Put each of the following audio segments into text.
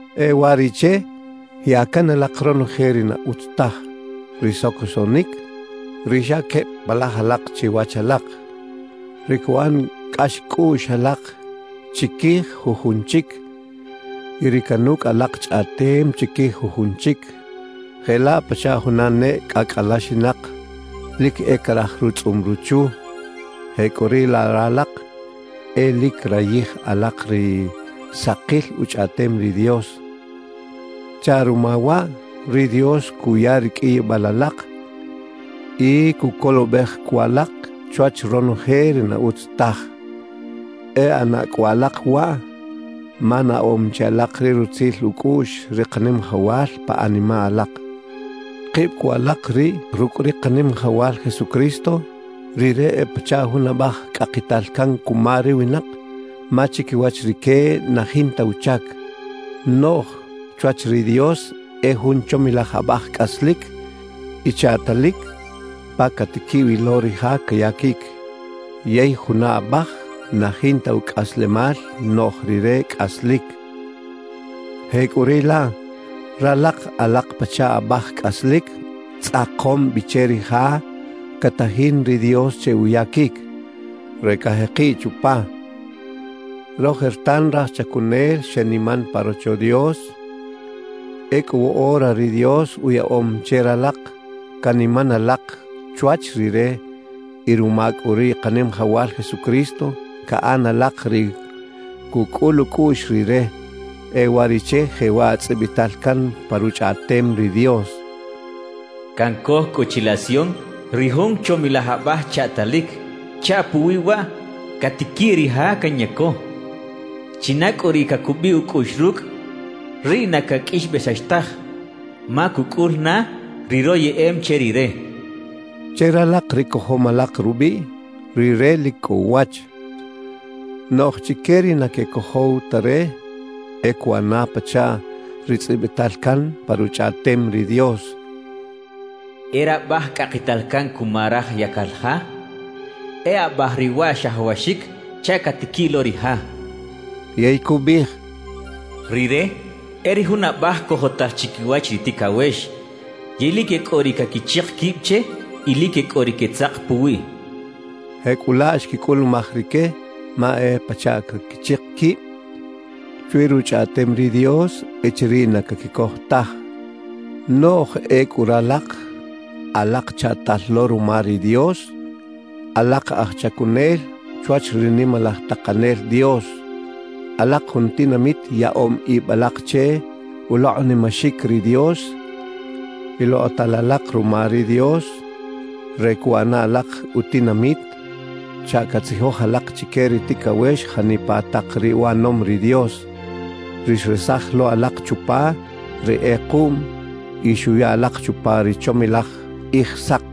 E uwariꞌche yaꞌa kan alaq ronoje ri na utz taj: ri sokosoꞌnik, ri xa kebꞌ palaj alaq chiwach alaq, ri kuꞌan kꞌax kꞌuꞌx alaq chikij jujun chik y ri kanukꞌ alaq chꞌaꞌtem chikij jujun chik. Jelaꞌ pachaꞌ juna neꞌ kꞌakꞌ alaxinaq lik e karaj rutzꞌum ruchu; jekꞌuriꞌlaꞌ ralaq, e lik rayij alaq ri saqil Uchꞌaꞌtem ri Dios, chaꞌ ruma waꞌ, ri Dios kuya ri kꞌiyibꞌal alaq y kukolobꞌej kꞌu alaq chwach ronoje ri na utz taj. E ꞌana kꞌu alaq waꞌ ma naꞌom chi alaq ri rutzil ukꞌuꞌx ri Qanimajawal pa animaꞌ alaq. Qibꞌ kꞌu alaq riꞌ rukꞌ ri Qanimajawal Jesucristo. Rire e pachaꞌ jun abꞌaj kꞌaqital kan kuma ri winaq, ma chikiwach rike na jinta uchak; noꞌj chwach ri Dios e jun chomilaj abꞌaj kꞌaslik y chaꞌtalik, pa katikiꞌ wi lo ri ja kayakik. Yey juna abꞌaj na jinta ukꞌaslemal, noꞌj Rire kꞌaslik. Jekꞌuriꞌlaꞌ ralaq alaq pachaꞌ abꞌaj kꞌaslik tzꞌaqom bꞌi che ri ja katajin ri Dios che uyakik re kajeqiꞌ chupa. Rojertan raj chakunel xeniman pa Rocho Dios, ekꞌu woꞌora ri Dios uyaꞌom che ralaq kaniman alaq chwach Rire y ruma kꞌu ri Qanimajawal Jesucristo kaꞌan alaq ri kukꞌul ukꞌuꞌx Rire. E uwariꞌche jewaꞌ tzꞌibꞌital kan pa Ruchꞌaꞌtem ri Dios: Kankoj kꞌu chilaꞌ Sion ri jun chomilaj abꞌaj chaꞌtalik, chaꞌ puwi waꞌ katikiꞌ ri ja kanyako. China kꞌu ri kakubꞌiꞌ ukꞌuꞌx rukꞌ, riꞌ na kakꞌixbꞌesax taj ma kukꞌul na ri royeꞌem che Rire kachaꞌ. Che ralaq ri kojom alaq rubꞌiꞌ, Rire lik kꞌo uwach; noꞌj chike ri na kekojow ta re, e kuꞌana pachaꞌ ri tzꞌibꞌital kan pa Ruchꞌaꞌtem ri Dios: E rabꞌaj kꞌaqital kan kuma raj yakal ja, e abꞌaj riꞌ waꞌ xajawaxik chaꞌ katikiꞌ lo ri ja. Yey kubꞌiꞌij: Rire e ri jun abꞌaj kojotal chikiwach ri tikawex, yey lik e kꞌo ri kakichiq kibꞌ che, y lik ekꞌo ri ketzaq puwiꞌ kachaꞌ. Jekꞌulaꞌ xkikꞌulumaj rike, ma e pachaꞌ “kakichiq kibꞌ” chwi Ruchꞌaꞌtem ri Dios echiriꞌ na kakikoj taj. Noꞌj ekꞌu ralaq alaq chaꞌtal lo ruma ri Dios, alaq aj chakunel chwach ri Nimalaj Taqanel Dios, alaq jun tinamit yaꞌom ibꞌ alaq che uloqꞌnimaxik ri Dios y loqꞌotal alaq ruma ri Dios re kuꞌana alaq utinamit chaꞌ katzijoj alaq chike ri tikawex janipa taq ri uꞌanom ri Dios, ri xresaj lo alaq chupa ri qꞌequꞌm y xuya alaq chupa ri chomilaj Qꞌijsaq.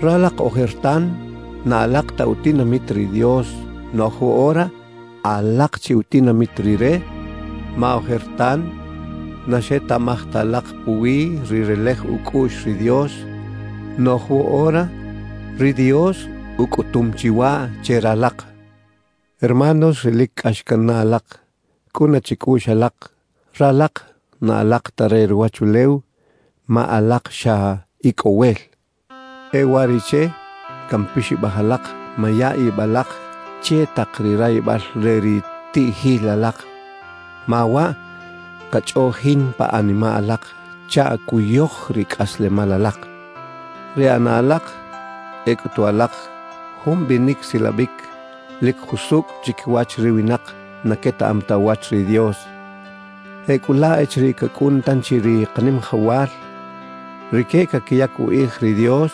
Ralaq ojertan na alaq ta utinamit ri Dios, noꞌj woꞌora alaq chi utinamit Rire. Ma ojertan na xetaꞌmaj ta alaq puwi ri relej ukꞌuꞌx ri Dios; noꞌj woꞌora ri Dios ukꞌutum chi waꞌ che ralaq. Hermanos ri lik kꞌax kannaꞌ alaq, kꞌuna chikꞌuꞌx alaq, ralaq na alaq ta re ruwachulew, ma alaq xa ikꞌowel. E uwariꞌche kampixabꞌaj alaq, maya ibꞌ alaq che taq ri rayibꞌal re ri tiꞌjil alaq ma waꞌ kachꞌoꞌjin pa animaꞌ alaq chaꞌ kuyoj ri kꞌaslemal alaq. Ri ꞌana alaq e kꞌutu alaq jun bꞌinik silabꞌik lik jusukꞌ chikiwach ri winaq na ketaꞌam ta uwach ri Dios. Jekꞌulaꞌ echiriꞌ kakꞌun tanchi ri Qanimajawal, rike kakiyak uqꞌij ri Dios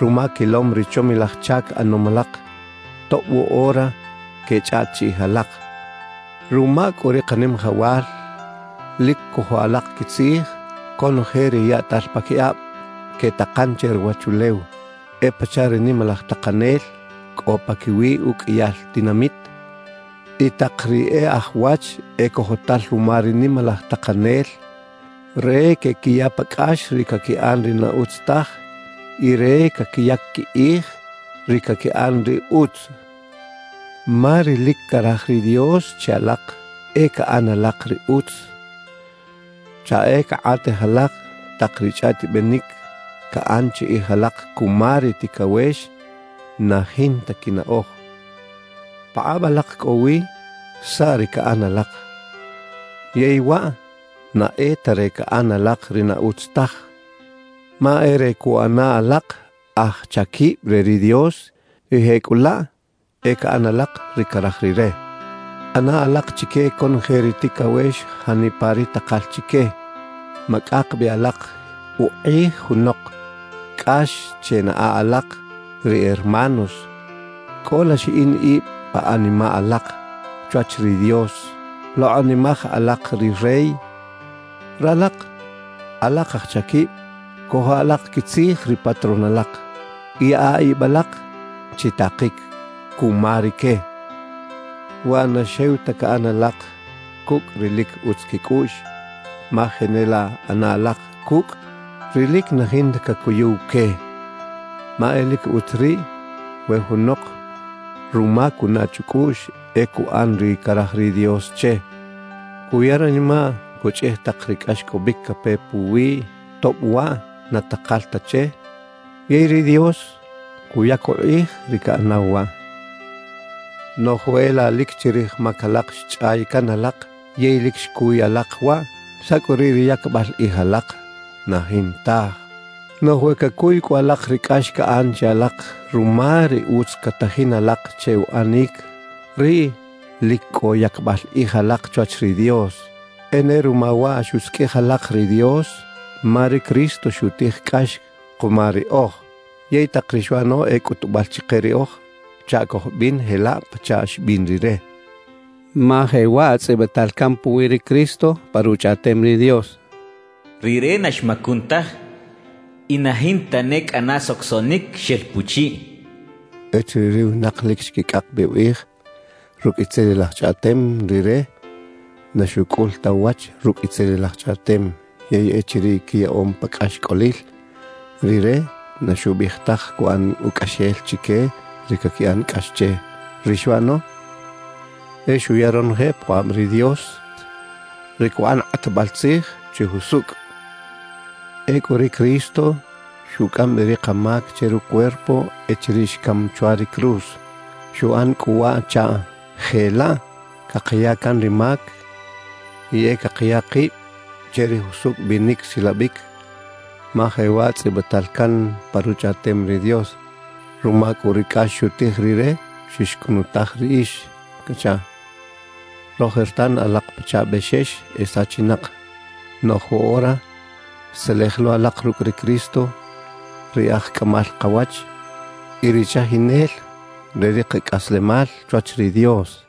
ruma kilom ri chomilaj chak ꞌanom alaq, tobꞌ woꞌora kechꞌaꞌt chiꞌij alaq. Ruma kꞌu ri Qanimajawal, lik kojo alaq kitzij konoje ri yaꞌtal pakiqꞌabꞌ ketaqan che ruwachulew, e pachaꞌ ri nimalaj taqanel kꞌo pakiwi ukꞌiyal tinamit y taq ri e aj wach ekojotal ruma ri nimalaj taqanel re kekiya pa kꞌax ri kakiꞌan ri na utz taj y re kakiyak kiqꞌij ri kakiꞌan ri utz. Ma ri lik karaj ri Dios che alaq e kaꞌan alaq ri utz chaꞌ e kaqꞌatej alaq taq ri chꞌaꞌtibꞌenik kaꞌan chiꞌij alaq kuma ri tikawex na jinta kinaꞌoj. Paqꞌabꞌ alaq kꞌo wi saꞌ ri kaꞌan alaq; yey waꞌ na e ta re kaꞌan alaq ri na utz taj, ma e re kuꞌana alaq aj chakibꞌ re ri Dios y jekꞌulaꞌ e kaꞌan alaq ri karaj Rire. ꞌAna alaq chike konoje ri tikawex janipa ri taqal chike; makꞌaq bꞌi alaq uqꞌij junoq. Kꞌax chenaꞌa alaq ri hermanos. Kꞌola xiꞌin ibꞌ pa animaꞌ alaq chwach ri Dios. Loqꞌnimaj alaq ri rey. Ralaq alaq aj chakibꞌ, kojo alaq kitzij ri patrón alaq y yaꞌa ibꞌ alaq chitaqik kuma rike. Waꞌ na xew ta kaꞌan alaq kukꞌ ri lik utz kikꞌuꞌx ma jenelaꞌ ꞌana alaq kukꞌ ri lik na jinta kakuyuw ke. Ma e lik utz riꞌ we junoq ruma kunaꞌ chukꞌuꞌx e kuꞌan ri karaj ri Dios che, kuya ranimaꞌ kuchꞌij taq ri kꞌaxkꞌobꞌik kape puwiꞌ tobꞌ waꞌ na taqal ta che. ¡Yey ri Dios kuyak uqꞌij ri kaꞌanaw waꞌ! Noꞌj we e laꞌ lik chirij mak alaq xchꞌay kan alaq yey lik xkuy alaq waꞌ, ¿saꞌ kꞌu riꞌ ri yakbꞌal qꞌij alaq? ¡Na jintaj! Noꞌj we kakuy kꞌu alaq ri kꞌax kaꞌan che alaq ruma ri utz katajin alaq che uꞌanik, riꞌ lik kꞌo yakbꞌal qꞌij alaq chwach ri Dios. E ne ruma waꞌ xusikꞌij alaq ri Dios, ma ri Cristo xutij kꞌax quma riꞌoj; yey taq ri xuꞌano e kꞌutubꞌal chiqe riꞌoj chaꞌ kojbꞌin jelaꞌ pachaꞌ xbꞌin Rire. Ma jewaꞌ tzꞌibꞌital kan puwi ri Cristo pa Ruchꞌaꞌtem ri Dios: Rire na xmakun taj, y na jinta ne kꞌana sokosoꞌnik xel puchiꞌ kachaꞌ. Echiriꞌ ri winaq lik xkikꞌaq bꞌi uqꞌij rukꞌ itzelilaj chꞌaꞌtem, Rire na xukꞌul ta uwach rukꞌ itzelilaj chꞌaꞌtem. Yey echiriꞌ kiyaꞌom pa kꞌaxkꞌolil, Rire na xubꞌiꞌij taj kuꞌan ukꞌaxel chike ri kakiꞌan kꞌax che; ri xuꞌano, e xuya ronoje puqꞌabꞌ ri Dios, ri kuꞌan qꞌatbꞌal tzij chi jusukꞌ. Ekꞌu ri Cristo xukꞌam bꞌi ri qamak che rucuerpo echiriꞌ xkam chwa ri cruz. Xuꞌan kꞌu waꞌ chaꞌ jelaꞌ kaqaya kan ri mak y e kaqaya qibꞌ che ri jusukꞌ bꞌinik silabꞌik. Ma jewaꞌ tzꞌibꞌital kan pa Ruchꞌaꞌtem ri Dios: Ruma kꞌu ri kꞌax xutij Rire, xixkunutaj riꞌix kachaꞌ. Rojertan, alaq pachaꞌ bꞌexex e sachinaq; noꞌj woꞌora xtzelej lo alaq rukꞌ ri Cristo, ri Aj Kꞌamal Qawach y ri Chajinel re ri qakꞌaslemal chwach ri Dios.